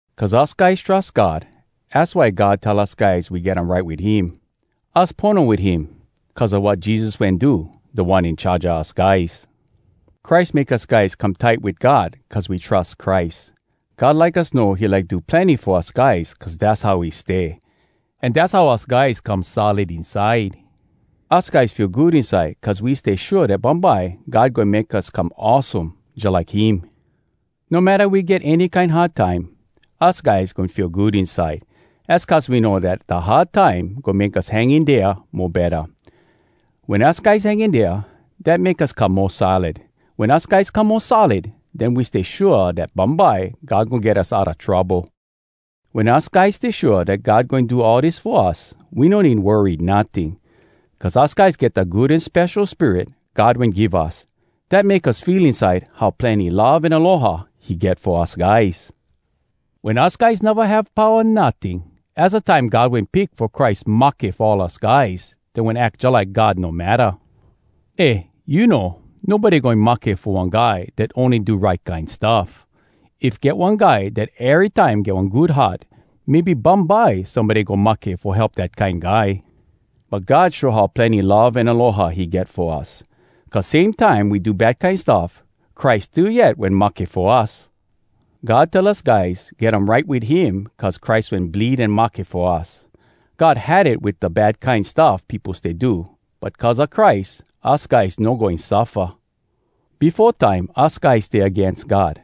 Cuz us guys trus God, az why God tell us guys we get um right wit him. Us pono wit him, cuz a wat Jesus wen do, Da One In Charge a us guys. Christ make us guys come tight wit God cuz we trus Christ. God like us know he like do plenny fo us guys cuz dass how he stay. An dass how us guys come solid inside. Us guys feel good inside cuz we stay shua dat bumbye God goin make us come awesome jalike him. No matta we get any kine hard time, us guys goin feel good inside. Az cuz we know dat da hard time goin make us hang in dea mo betta. Wen us guys hang in dea, dat make us come mo solid. Wen us guys come mo solid, den we stay shua dat bumbye God goin get us outa trouble. Wen us guys stay shua dat God goin do all dis fo us, we no need worry notting. Cuz us guys get da Good An Spesho Spirit God wen give us, dat make us feel inside how plenny love an aloha he get fo us guys. Wen us guys neva have powa notting, az da time God wen pick fo Christ mahke fo all us guys dat wen ack jalike God no matta. Eh you know, nobody goin mahke fo one guy dat ony do right kine stuff! If get one guy dat erytime get one good heart, maybe bumbye somebody go mahke fo help dat kine guy. But God show how plenny love an aloha he get fo us, cuz same time we do bad kine stuff, Christ still yet wen mahke fo us. God tell us guys get um right wit him cuz Christ wen bleed an mahke fo us. God had it wit da bad kine stuff peopo stay do, but cuz a Christ, us guys no goin suffa. Befo time us guys stay agains God.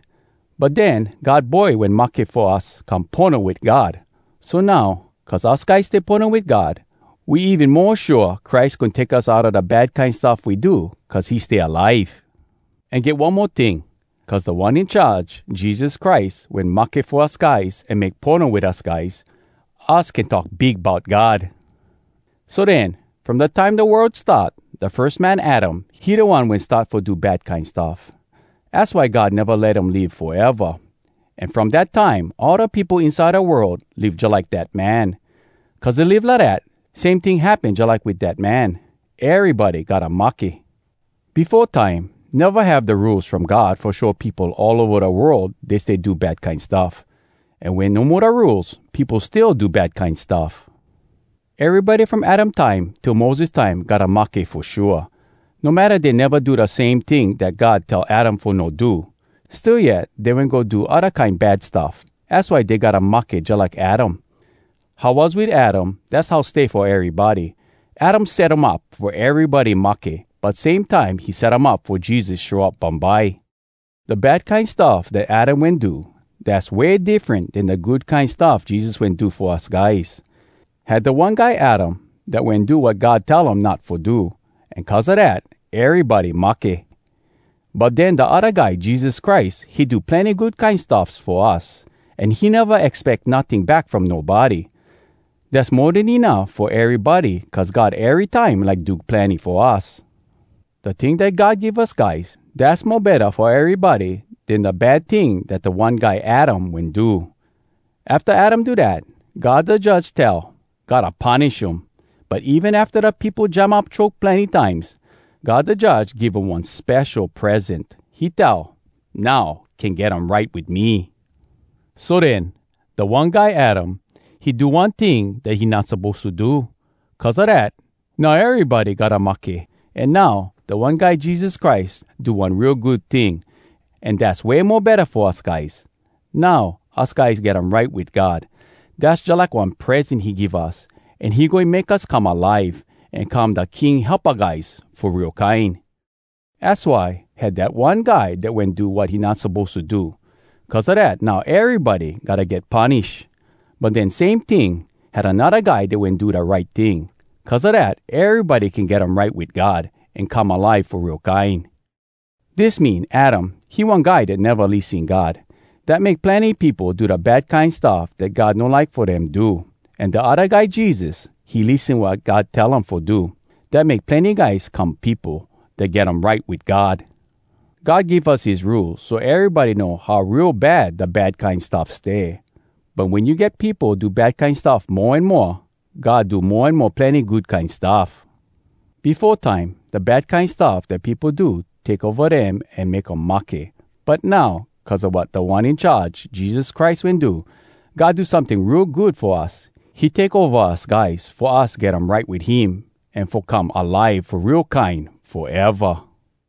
But den God Boy wen mahke fo us come pono wit God. So now, cuz us guys stay pono wit God, we even mo shua Christ goin take us outa da bad kine stuff we do cuz he stay alive. An get one mo ting! Cuz Da One In Charge, Jesus Christ, wen mahke fo us guys an make pono wit us guys, us can talk big bout God. So den, from da time da world start, da firs man Adam, he da one wen start fo do bad kine stuff. Az why God neva let um live foeva. An from dat time, all da peopo inside da world live jalike dat man. Cuz dey live lidat, same ting happen jalike wit dat man, erybody gotta mahke. Befo time, neva have da Rules from God fo show peopo all ova da world dey stay do bad kine stuff. An wen no mo da Rules, peopo still do bad kine stuff. Erybody from Adam time till Moses time gotta mahke fo shua, no matta dey neva do da same ting dat God tell Adam fo no do. Still yet, dey wen go do odda kine bad stuff. Az why dey gotta mahke jalike Adam. How was wit Adam, dass how stay fo erybody. Adam set um up fo erybody mahke, but same time he set um up fo Jesus show up bumbye. Da bad kine stuff dat Adam wen do, dass way diffren den da good kine stuff Jesus wen do fo us guys. Had da one guy Adam dat wen do wat God tell um not fo do, an cuz a dat, erybody mahke. But den da odda guy, Jesus Christ, he do plenny good kine stuffs fo us, an he neva expeck notting back from nobody. Dass mo den enuff fo erybody cuz God erytime like do plenny fo us. Da ting dat God give us guys, dass mo betta fo erybody den da bad ting dat da one guy Adam wen do. Afta Adam do dat, God da Judge tell, “Gotta punish um!” But even afta da peopo jam up choke plenny times, God da Judge give um one spesho present—he tell, “Now, can get um right wit me!” So den, da one guy Adam, he do one ting dat he not suppose to do. Cuz a dat, now erybody gotta mahke. An now, da one guy Jesus Christ do one real good ting, an dass way mo betta fo us guys. Now, us guys get um right wit God. Dass jalike one present he give us. An he goin make us come alive, an come da King helpa guys fo real kine. Az why, had dat one guy dat wen do wat he not suppose to do. Cuz a dat, now erybody gotta get punish. But den same ting, had anodda guy dat wen do da right ting. Cuz a dat, erybody can get um right wit God an come alive fo real kine. Dis mean, Adam, he one guy dat neva lissen God. Dat make plenny peopo do da bad kine stuff dat God no like fo dem do. An da odda guy Jesus, he lissen wat God tell him fo do. Dat make plenny guys come peopo dat get um right wit God. God give us his Rules so erybody know how real bad da bad kine stuff stay. But wen you get peopo do bad kine stuff mo an moa, God do mo an mo plenny good kine stuff. Befo time, da bad kine stuff dat peopo do take ova dem an make um mahke. But now, cuz a wat Da One In Charge, Jesus Christ, wen do, God do someting real good fo us. He take ova us guys, fo us get um right wit him an fo come alive fo real kine foeva.